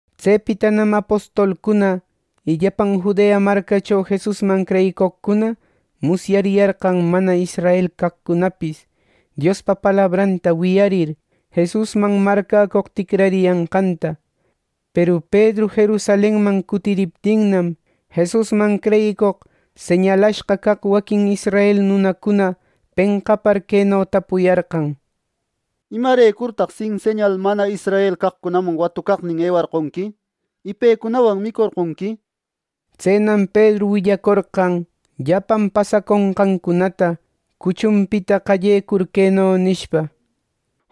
Tsepitanam apostolcuna y llapan Judea marcacho Jesusman creyicoqcuna musyariyarqan mana israel caqcunapis, Diospa palabranta wiyarir, Jesusman marcäcoq ticrariyanqanta. Peru Pedru Jerusalenman cutiriptinnam, Jesusman creyicoq señalashqa caq waquin israel nunacuna penqapar, queno tapuyarqan: —¿Imarecurtaq sin señal mana israel caqcunaman watucaqnin ewarqonqui, y pecunawan micorqonqui? —nishpa. Tsenam Pedru willacorqan llapan pasaconqancunata, cuchunpita qallecur, queno nishpa: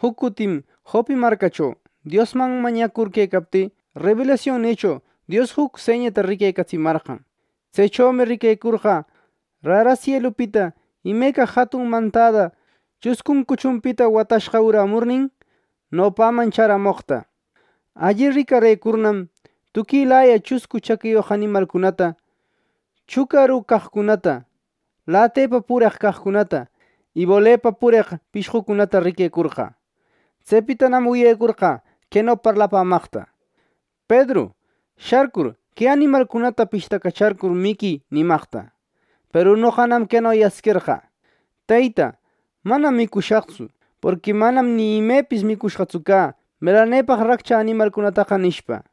—Juc cutim Jope marcacho, Diosman mañacur quecaptï, rebelasionnïcho Dios juc señata riquecatsimarqan. Tsechomi riquecorqä rara sielupita imeca jatun mantada chuscun cuchunpita watashqa urämurnin, nopäman chäramoqta. Alli ricarëcurnam, tuquilaya chuscu chaquiyoq animalcunata, chucaru caqcunata, latepa pureq caqcunata y bolepa pureq pishqucunata riquecorqä. Tsepitanam wiyecorqä queno parlapämaqta: ‘Pedru, sharcur, que animalcunata pishtacacharcur, miquï’ nimaqta. Peru noqanam queno yasquerqä: ‘Teyta, manam micushaqtsu; porqui manam ni imepis micushqatsu cä melanepaq raccha animalcunataqa’ nishpa.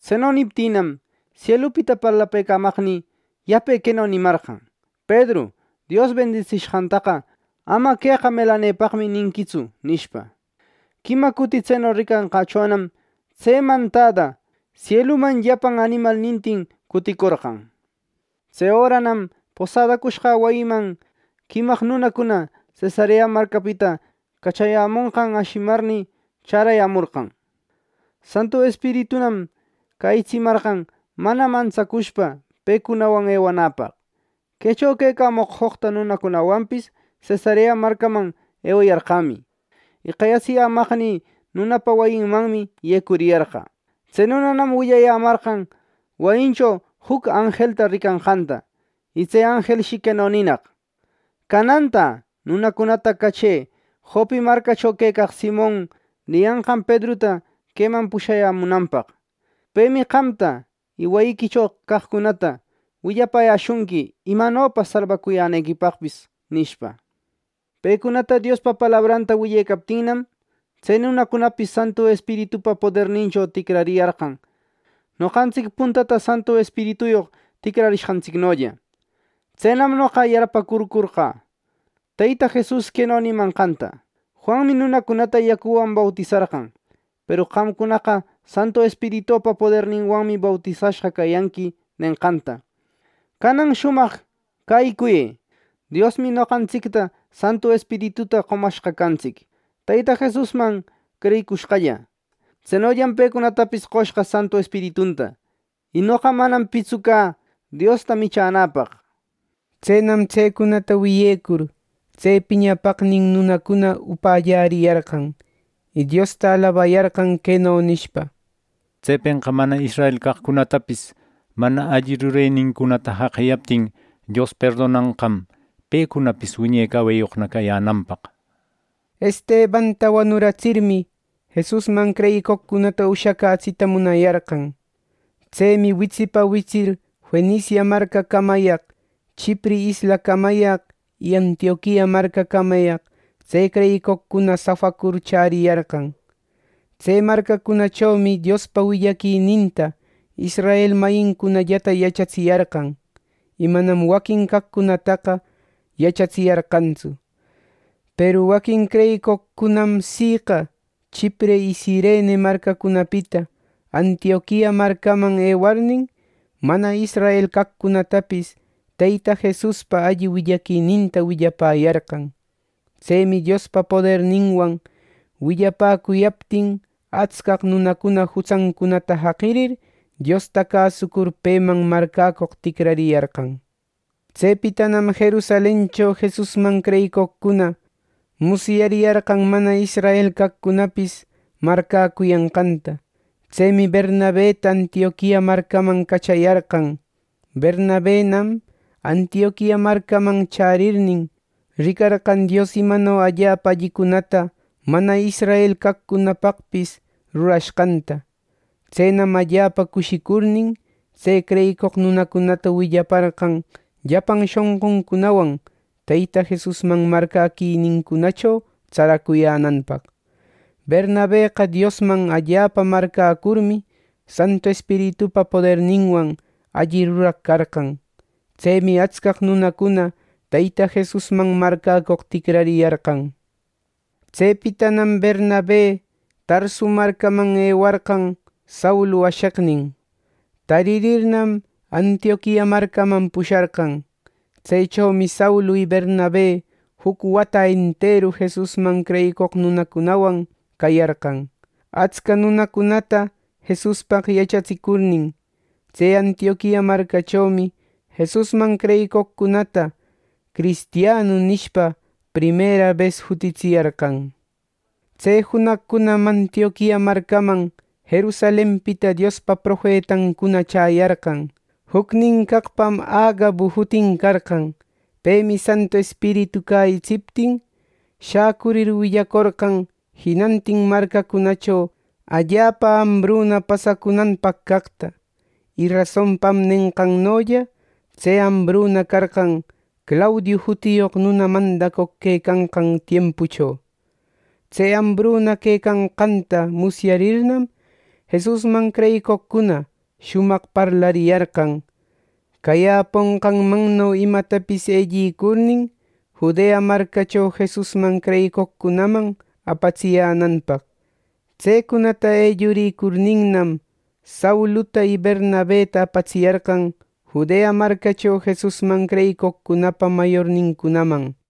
Tseno niptïnam, sielupita parlapëcamaqnï yape queno nimarqan: ‘Pedru, Dios bendisishqantaqa ama “Queqa melanepaqmi” ninquitsu’ nishpa. Quima cuti tseno ricanqächonam tse mantada sieluman llapan animalnintin cuticorqan. Tse öranam posadacushqä wayiman quimaq nunacuna Cesarea marcapita cachayämonqan ashimarnï, chärayämorqan. Santu Espiritunam cäyitsimarqan mana mantsacushpa pecunawan ewanäpa. Quecho quecamoq joqta nunacunawanpis Cesarea marcaman ewayarqämi; y qayatsiyämaqnï nunapa wayinmanmi yecuriyarqä. Tse nunanam willayämarqan wayincho juc anjelta ricanqanta; y tse anjelshi queno ninaq: ‘Canantä nunacunata cachë Jope marcacho quecaq Simon niyanqan Pedruta queman pushayämunanpaq. Pemi qamta y wayiquicho caqcunata willayäshunqui imanopa salbacuyänequipaqpis’ nishpa. Pecunata Diospa palabranta willecaptïnam, tse nunacunapis Santu Espiritupa podernincho ticrariyarqan, noqantsic puntata Santu Espirituyoq ticrarenqantsicnolla. Tsenam noqa yarpäcurcorqä Teyta Jesus queno nimanqanta: ‘Juanmi nunacunata yacuwan bautisarqan, peru qamcunaqa Santu Espiritupa poderninwanmi bautisashqa cayanqui’ nenqanta. Canan shumaq cäyicuyë. Diosmi noqantsicta Santu Espirituta qomashqa cantsic, Teyta Jesusman creyicushqalla. Tsenollam pecunatapis qoshqa Santu Espiritunta. Y noqa manam pitsu cä Diosta michänäpaq. Tsenam tsecunata wiyecur, tse piñapaqnin nunacuna upalläriyarqan, y Diosta alabayarqan, queno nishpa: —Tsepenqa mana israel caqcunatapis mana alli rurenincunata jaqiyaptin, Dios perdonanqam pecunapis wiñe caweyoqna cayänanpaq —nishpa. Estebanta wanuratsirmi, Jesusman creyicoqcunata ushacätsita munayarqan. Tsemi witsipa witsir Fenicia marcacamayaq, Chipre islacamayaq y Antioquia marcacamayaq tse creyicoqcuna safacur chäriyarqan. Tse marcacunachomi Diospa willaquininta israel mayincunallata yachatsiyarqan; y manam waquin caqcunataqa yachatsiyarqantsu. Peru waquin creyicoqcunam siqa Chipre y Cirene marcacunapita Antioquia marcaman ewarnin, mana israel caqcunatapis Teyta Jesuspa alli willaquininta willapäyarqan. Tsemi Diospa poderninwan willapäcuyaptin, atscaq nunacuna jutsancunata jaqirir, Diosta cäsucur peman marcäcoq ticrariyarqan. Tsepitanam Jerusalencho Jesusman creyicoqcuna musyariyarqan mana israel caqcunapis marcäcuyanqanta. Tsemi Bernabeta Antioquia marcaman cachayarqan. Bernabenam, Antioquia marcaman chärirnin, ricarqan Dios imano allapa allicunata mana israel caqcunapaqpis rurashqanta. Tsenam allapa cushicurnin, tse creyicoq nunacunata willaparqan llapan shonquncunawan Teyta Jesusman marcäquinincunacho tsaracuyänanpaq. Bernabeqa Diosman allapa marcäcurmi, Santu Espiritupa poderninwan alli ruraq carqan. Tsemi atscaq nunacuna Teyta Jesusman marcäcoq ticrariyarqan. Tsepitanam Bernabe Tarsu marcaman ewarqan Saulu asheqnin. Taririrnam, Antioquia marcaman pusharqan. Tsechomi Saulu y Bernabe juc wata enteru Jesusman creyicoq nunacunawan cayarqan, atsca nunacunata Jesuspaq yachatsicurnin. Tse Antioquia marcachomi Jesusman creyicoqcunata “Cristianu” nishpa primera bes jutitsiyarqan. Tse junaqcunam Antioquia marcaman Jerusalenpita Diospa profetancuna chäyarqan. Jucnin caqpam Agabu jutin carqan. Pemi Santu Espiritu cäyitsiptin, shacurir willacorqan jinantin marcacunacho allapa ambruna pasacunanpaq caqta. (Y rasonpam nenqannolla tse ambruna carqan Claudiu jutiyoq nuna mandacoq quecanqan tiempucho.) Tse ambruna quecanqanta musyarirnam, Jesusman creyicoqcuna shumaq parlariyarqan, cayäponqanmanno imatapis ellicurnin, Judea marcacho Jesusman creyicoqcunaman apatsiyänanpaq. Tsecunata ellurïcurninnam, Sauluta y Bernabeta apatsiyarqan Judea marcacho Jesusman creyicoqcunapa mayornincunaman.